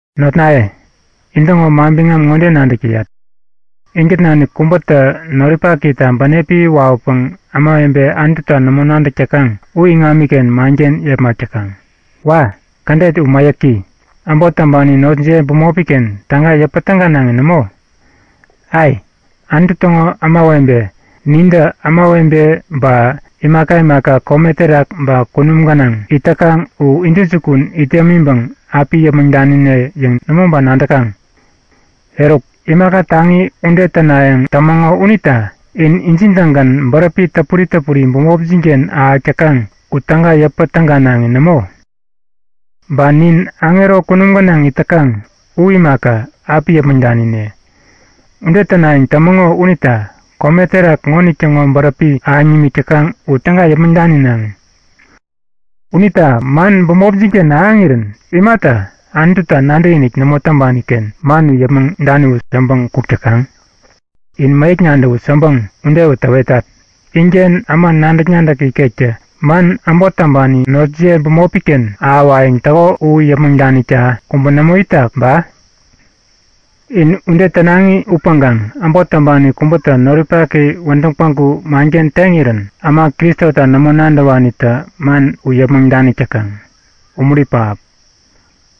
Notnaye, intäŋo manbiŋam ŋode nadäk täyat; Inkät nanik kubätä noripakita bänepi wawäpäŋ ämawebe Anututa nämo nadäk täkaŋ u iŋamiken manken yepmak täkaŋ. Wa! Kädet u mäyäki! Äbot täŋpani notjiye bämopi-ken täga yäpä täganaŋi nämo? Ai! Anutu täŋo kudupi ämawebe nintä ämawebe ba imaka imaka kome terak ba kunum gänaŋ it täkaŋ u intäjukun it yämiŋpäŋ api yäpmäŋ danine yäŋ nämo ba nadäkaŋ? Eruk, imaka taŋi ude tänayäŋ tämäŋo unita in injin-tägän bäräpi täpuri täpuri bämopjin-ken ahäk täkaŋ u täga yäpä täganaŋi nämo? Ba nin aŋero kunum gänaŋ it täkaŋ u imaka, api yäpmäŋ danine. Ude tänayäŋ tämäŋo unita kome terak ŋonitäŋo bäräpi ahäŋ nimik täkaŋ u täga yäpmäŋ daninaŋi! Unita man bämopjin-ken ahäŋirän imata Anututa nadäkinik nämo täŋpani-ken man u yäpmäŋ daniwut yäŋpäŋ kuk täkaŋ? In mäyäk nadäwut yäŋpäŋ ude täwetat! Inken äma nadäk-nadäk ikektä man äbot täŋpani notjiye bämopi-ken ahäwayäŋ täko u yäpmäŋ danikta kubä nämo itak ba? In ude tänaŋi upäŋkaŋ äbot täŋpani kubätä noripaki wädäŋ päŋku manken teŋirän äma Kristota nämo nadäwanitä man u yäpmäŋ danik täkaŋ. Umuri pähap!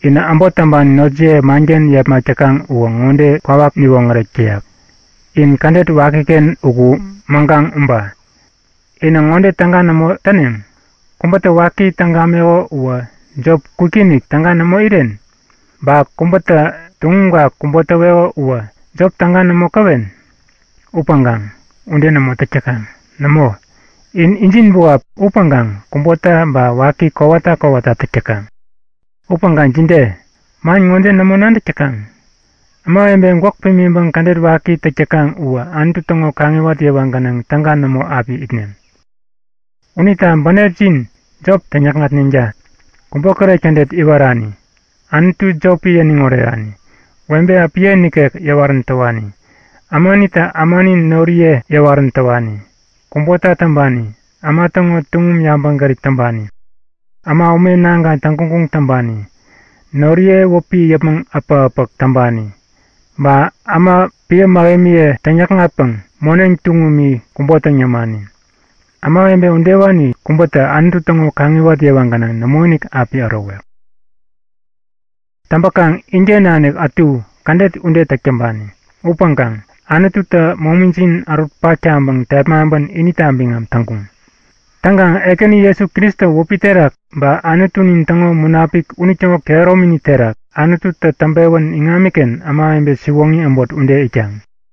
Inä äbot täŋpani notjiye manken yepmak täkaŋ uwä kwawak ŋode niwoŋärek täyak; In kädet wakiken uku mäŋkaŋ uba. Inä ŋode täga nämo täneŋ? Kubätä waki täŋ gameko uwä jop kwikinik täga nämo iren? Ba kubätä tuŋumka kubo täweko uwä jop täga nämo käwen? Upäŋkaŋ ude nämo täk täkaŋ. Nämo, in injin buap upäŋkaŋ kubota ba waki kowata kowata täk täkaŋ. Upäŋkaŋ jide? Man ŋode nämo nadäk täkaŋ? Ämawebe gwäk pimiŋpäŋ kädet waki täk täkaŋ uwä Anutu täŋo kaŋiwat yewa gänaŋ täga nämo api itneŋ. Unita bänepjin jop täŋyäkŋatneŋta! Kubokäret kädet iwarani, Anutu jopi yäniŋ orerani, webe äpiye nikek yäwarän täwani, ämanitä ämani noriye yäwarän täwani, kubota täŋpani, äma täŋo tuŋum yabäŋgärip täŋpani, äma ume naŋkaŋ täŋguŋguŋ täŋpani, noriye wäpi yäpmäŋ äpäk-äpäk täŋpani ba äma piä mähemiye täŋyäkŋatpäŋ moneŋ tuŋumi kubo täŋ yämani, ämawebe udewani kubätä Anutu täŋo kaŋiwat yewa gänaŋ nämoinik api ärowek. Täŋpäkaŋ inken nanik ätu kädet ude täk täŋpani. Upäŋkaŋ Anututä momijin ärutpak taŋpäŋ tepmaŋpän inita biŋam täŋkuŋ. Täŋkaŋ Ekäni Jesu Kristo wäpi terak ba Anutunin täŋo Munapik unitäŋo kehäromini terak Anututä täŋpewän iŋamiken ämawebe siwoŋi äbot ude itkaŋ.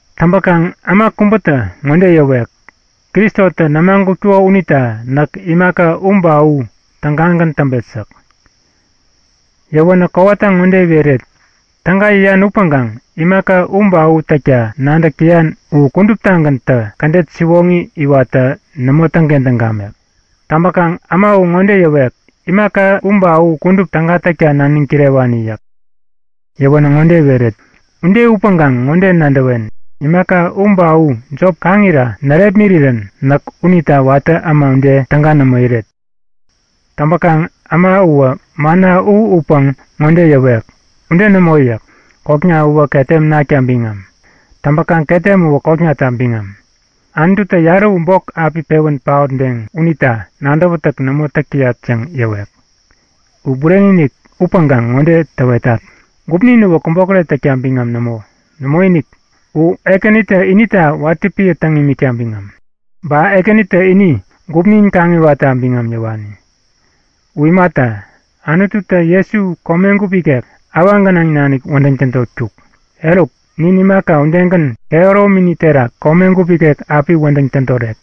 Täŋpäkaŋ äma kubätä ŋode yäwek; Kristotä nämagutkuko unita näk imaka u ba u tägagän täŋpet yäk. Yäwänä kowata ŋode iweret; Täga yäyan upäŋkaŋ imaka u ba u täkta nadäk täyan u kuduptagäntä kädet siwoŋi iwatta nämo täŋkentäŋ gamek. Täŋpäkaŋ äma u ŋode yäwek; Imaka u ba u kudup täga täkta naniŋ kirewani yäk. Yäwänä ŋode iweret; Ude upäŋkaŋ ŋode nadäwen; Imaka u ba u jop kaŋira närepmirirän näk unita watä äma ude täga nämo iret. Täŋpäkaŋ äma uwä manna u utpäŋ ŋode yäwek; Ude nämo yäk. Kokna uwä ketem nakta biŋam. Täŋpäkaŋ ketem uwä koknata biŋam. Anututä yarä u bok api pewän paotdeŋ unita nadäwätäk nämo täk täyat yäŋ yäwek. U bureni upäŋkaŋ ŋode täwetat; Gupnin uwä kubokäret täkta biŋam nämo. Nämoinik, u Ekänitä inita watä piä täŋ imikta biŋam. Ba Ekänitä ini gupnin kaŋiwatta biŋam yäwani. U imata, Anututä Jesu komegup ikek awaŋ gänaŋ nanik wädäŋ tädotkuk. Eruk, nin imaka udegän kehäromini terak komegup ikek api wädäŋ tädorek.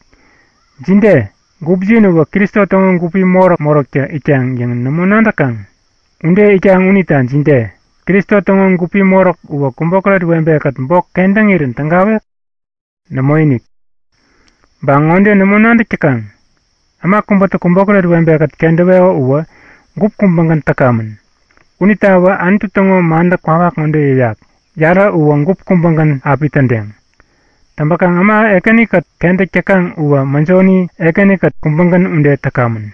Jide? Gupjin uwä Kristo täŋo gupi moräk-moräktä itkaŋ yäŋ nämo nadäkaŋ? Ude itkaŋ unita jide? Kristo täŋo gupi moräk uwä kubokäret webekät bok kentäŋirän tägawek? Nämoinik! Ba ŋode nämo nadäk täkaŋ? Äma kubätä kubokäret webekät kentäweko uwä gup kubägän täkamän. Unitawä Anutu täŋo mantä kwawak ŋode yäyak; Yarä uwä gup kubägän api tädeŋ. Täŋpäkaŋ äma Ekäni-kät kentäk täkaŋ uwä mäjoni Ekäni-kät kubägän ude täkamän.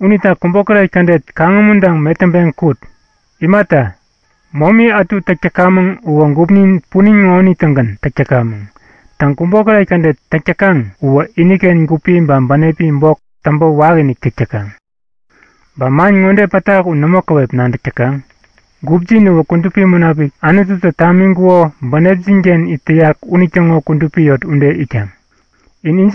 Unita kubokäret kädet kaŋumuntaŋ metäŋpeŋ kut. Imata, momi ätu täk täkamäŋ uwä gupnin punin ŋonitä-gän täk täkamäŋ. Täŋ, kubokäret kädet täk täkaŋ uwä iniken gupi ba bänepi bok täŋpä wakiinik täk täkaŋ. Ba man ŋode pätak u nämo käwep nadäk täkaŋ? Gupjin uwä Kudupi Munapik, Anututä tamiŋkuko bänepjin-ken it täyak unitäŋo kudupi yot ude itkaŋ. In injinta biŋam nämo!